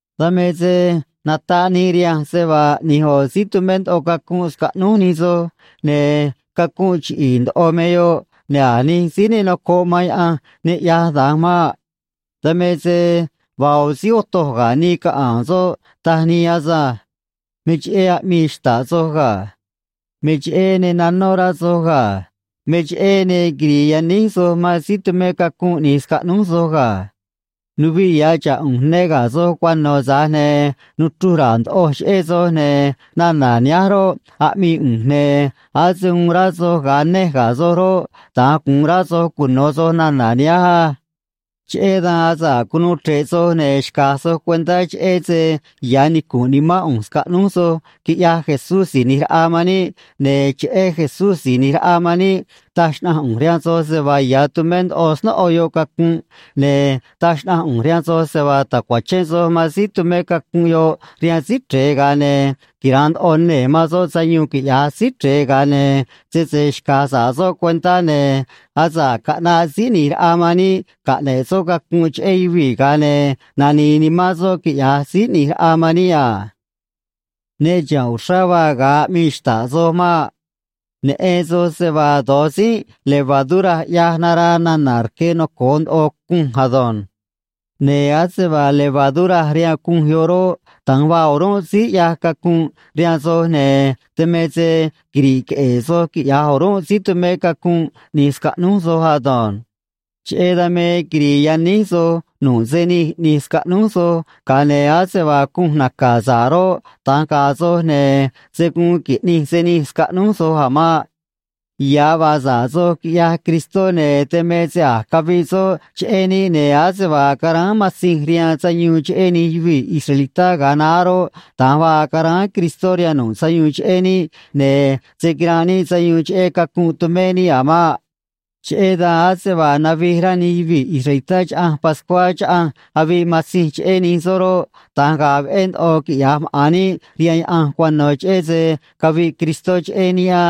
Dan me se nataꞌ nii rihanj se vaa ꞌni̱j ꞌo̱ síí tumé ndoꞌo cacunꞌ scaꞌnúj nij soj, ne̱ cacunꞌ chiꞌi̱i̱ ndoꞌo me yoꞌ, ne̱ a̱ nij síí ne nocoꞌ man Yaꞌanj ne ꞌyaj da̱nj maꞌ. Dan me se vaa ꞌo̱ síí otoj ga̱ nii caꞌa̱a̱n soꞌ, taj nii asânj. Me cheꞌé aꞌmii xta̱ꞌ soj ga̱. Me cheꞌé ne nanó rá soj ga̱. Me cheꞌé ne quiri̱i̱ yaníj soj man síí tumé cacunꞌ ꞌni̱j scaꞌnúj soj ga̱. Nuviꞌ ya̱ xa̱ꞌ ꞌu̱nj ne ga̱ soj cuano̱, tza̱j ne̱ nuchruj ra̱a̱ ndoꞌoj cheꞌé soj, ne̱ nana̱ nihánj roꞌ, aꞌmii ꞌu̱nj, ne̱ ase uun rá soj ga̱a nej ga̱ soj roꞌ, da̱nj gu̱un rá soj cuno̱ soj nana̱ nihánj á. Cheꞌé dan asa̱ꞌ cunuu chre̱ꞌ soj, ne̱ xca̱j soj cuentá cheꞌé se ya̱ nicu̱nꞌ nimán ꞌu̱nj scaꞌnúj soj, quiꞌya̱j Jesús Si̱j ꞌNi̱j Raꞌa man níꞌ, ne̱ cheꞌé Jesús Si̱j ꞌNi̱j Raꞌa man níꞌ taj xnaꞌanj ꞌu̱nj rihaan soj se vaa ya̱ tumé ndoꞌo snóꞌo yoꞌ cacunꞌ, ne̱ taj xnaꞌanj ꞌu̱nj rihaan soj se vaa ta̱cuachén soj man síí tumé cacunꞌ yoꞌ rihaan Síí Chre̱e, ga̱a ne̱ quira̱nꞌ ndoꞌo nee̱ man soꞌ sayuun, quiꞌya̱j Síí Chre̱e, ga̱a ne̱ sese xca̱j sa̱ꞌ soꞌ cuentá, ne̱ asa̱ꞌ caꞌnaꞌ Síí ꞌNi̱j Raꞌa man níꞌ caꞌne̱ꞌ soꞌ cacunꞌ cheꞌé yuvii̱, ga̱a ne̱ nani̱i̱ nimán soꞌ, quiꞌya̱j Síí ꞌNi̱j Raꞌa man níꞌ a. Ne chiha̱nꞌ uxrá vaa ga̱a aꞌmii xta̱ꞌ soj maꞌ. Neꞌen soj se vaa do̱j tzínꞌ levadura ꞌyaj naraa nana̱ rque noco̱o ndoꞌo cunj ado̱nj. Ne̱ ase vaa levadura rihaan cunj yoꞌ roꞌ, da̱nj vaa o̱rúnꞌ síí ꞌyaj cacunꞌ rihaan soj, ne̱ dan me se quiri̱ꞌ queꞌe̱e̱ soj, quiꞌya̱j o̱rúnꞌ síí tumé cacunꞌ ꞌni̱j scaꞌnúj soj ado̱nj. Cheꞌé dan me quiri̱i̱ yaníj soj nu̱ꞌ se nij ꞌni̱j scaꞌnúj soj, ga̱a ne̱ ase vaa cunj naca̱ sa̱ꞌ roꞌ, da̱nj ga̱a̱ soj, ne̱ se̱ guun qui̱ꞌnij se nij scaꞌnúj soj a̱ maꞌ. Ya̱ vaa sa̱ꞌ soj, quiꞌyaj Cristó, ne̱ dan me se a̱j caviꞌ soꞌ cheꞌé níꞌ, ne̱ ase vaa caráán matzinj rihaan sayuun cheꞌé nij yuvii̱ israelitá ga̱a naá roꞌ, da̱nj vaa caráán Cristó rihaan nu̱ꞌ sayuun cheꞌé níꞌ, ne̱ se̱ quiranꞌ níꞌ sayuun cheꞌé cacunꞌ tumé níꞌ a̱ maꞌ. Cheꞌé dan, ase vaa navij rá nij yuvii̱ israelitá Chaꞌanj Pascuá chaꞌanj aviꞌ matzinj cheꞌé nij soꞌ roꞌ, da̱nj ga̱a̱ veꞌé ndoꞌo quiꞌya̱j maꞌa̱n níꞌ rihaan Yaꞌanj cuano̱, cheꞌé se caviꞌ Cristó cheꞌé níꞌ á.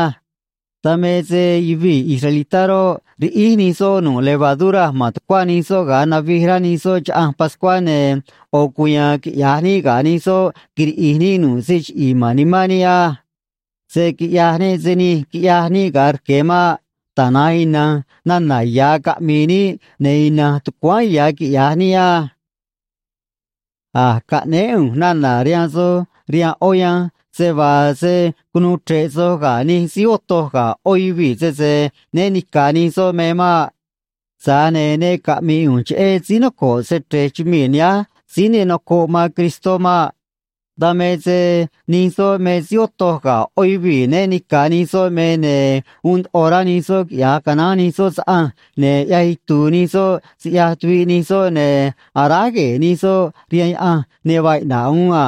Dan me se yuvii̱ israelitá roꞌ, riꞌíj nij soꞌ nu̱ꞌ levadura ma̱n tucuá nij soꞌ ga̱a navij rá nij soꞌ Chaꞌanj Pascuá, ne̱ ꞌo̱ cuya̱a̱n quiꞌya̱j níꞌ ga̱ nij soꞌ, quiriꞌi̱j níꞌ nu̱ꞌ se chiꞌi̱i̱ ma̱n nimán níꞌ á. Se̱ quiꞌyaj níꞌ se nij quiꞌyaj níꞌ ga̱a rque̱ maꞌ. Tana̱nj ina̱nj nana̱ ya̱ caꞌmi̱i̱ níꞌ, ne̱ ina̱nj tucuáán ya̱ quiꞌya̱j níꞌ á. A̱j caꞌnéé ꞌu̱nj nana̱ rihaan soj rihaan ꞌó yanj se vaa se̱ cunuu chre̱ꞌ soj ga̱ nij síí otoj ga̱ ꞌó yuvii̱ sese né ni̱ca̱ nij soꞌ me maꞌ. Tza̱j ne̱ ne caꞌmi̱i̱ ꞌu̱nj cheꞌé síí noco̱ꞌ se‑chre̱j chumii̱ nihánj síí ne nocoꞌ man Cristó maꞌ. Dan me se nij soꞌ me síí otoj ga̱ ꞌó yuvii̱ né ni̱ca̱ nij soꞌ me, ne̱ uun ndoꞌo rá nij soꞌ quiꞌya̱j canaán nij soꞌ saꞌanj, ne̱ ꞌyaj itu̱u̱ nij soꞌ siꞌyaj tuviꞌ nij soꞌ, ne̱ aráj gue̱e̱ nij soꞌ rihaan yaꞌanj ne vaa iꞌna̱ꞌ uún a.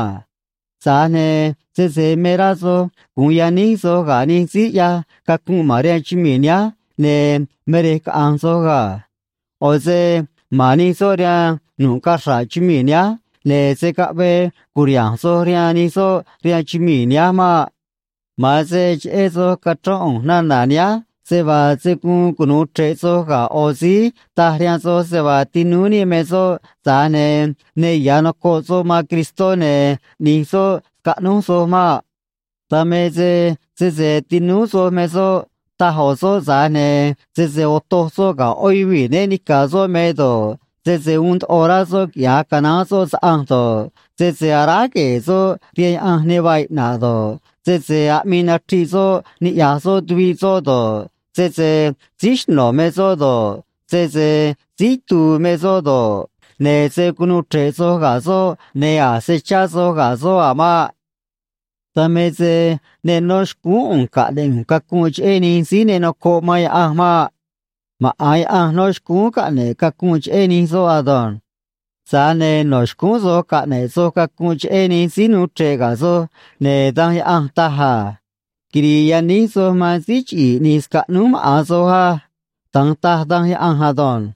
Tza̱j ne̱ sese me rá soj gu̱un yaníj soj ga̱ nij síí ꞌyaj cacunꞌ ma̱n rihaan chumii̱ nihánj, ne̱ me rej caꞌa̱nj soj ga̱. ꞌO̱ se ma̱n nij soꞌ rihaan nu̱ꞌ cachra̱ꞌ chumii̱ nihánj, ne̱ se̱ caꞌvee cu̱riha̱nj soj rihaan nij soꞌ rihaan chumii̱ nihánj maꞌ. Ma̱an se cheꞌé soj cachrón ꞌu̱nj nana̱ nihánj se vaa se̱ guun cunu̱u chre̱ꞌ soj ga̱ ꞌo̱ síí taj rihaan soj se vaa tinúú níꞌ me soꞌ, tza̱j ne̱ ne ya̱ nocoꞌ soꞌ man Cristó, ne̱ ꞌni̱j soꞌ scaꞌnúj soj maꞌ. Dan me se sese tinúú soj me soꞌ, taj ꞌo̱ soꞌ, tza̱j ne̱ sese otoj soꞌ ga̱ ꞌó yuvii̱ né ni̱ca̱ soꞌ me do̱ꞌ, sese uun ndoꞌo rá soꞌ quiꞌya̱j canaán soꞌ saꞌanj do̱ꞌ, sese aráj gue̱e̱ soꞌ rihaan yaꞌanj ne vaa iꞌna̱ꞌ do̱ꞌ, sese aꞌmii nachriꞌ soꞌ niꞌya̱j soꞌ tuviꞌ soꞌ do̱ꞌ, sese síí xno̱ me soꞌ do̱ꞌ, sese síí itu̱u̱ me soꞌ do̱ꞌ, ne̱ se̱ cunuu chre̱ꞌ soj ga̱ soꞌ ne̱ a̱ se̱ chá soj ga̱ soꞌ a̱ maꞌ. Dan me se ne nó xcúún ꞌu̱nj caꞌne̱ꞌ ꞌu̱nj cacunꞌ cheꞌé nij síí ne nocoꞌ man Yaꞌanj maꞌ. Maꞌa̱n Yaꞌanj nó xcúún caꞌne̱ꞌ cacunꞌ cheꞌé nij soꞌ ado̱nj. Tza̱j ne̱ no̱ xcúún soj caꞌne̱ꞌ soj cacunꞌ cheꞌé nij síí nuu chre̱ꞌ ga̱ soj, ne̱ Danj Yaꞌanj taj a: “Quiri̱i̱ yaníj soj man síí chiꞌi̱i̱ ꞌni̱j scaꞌnúj maꞌa̱n soj á.” Da̱nj taj Danj Yaꞌanj ado̱nj.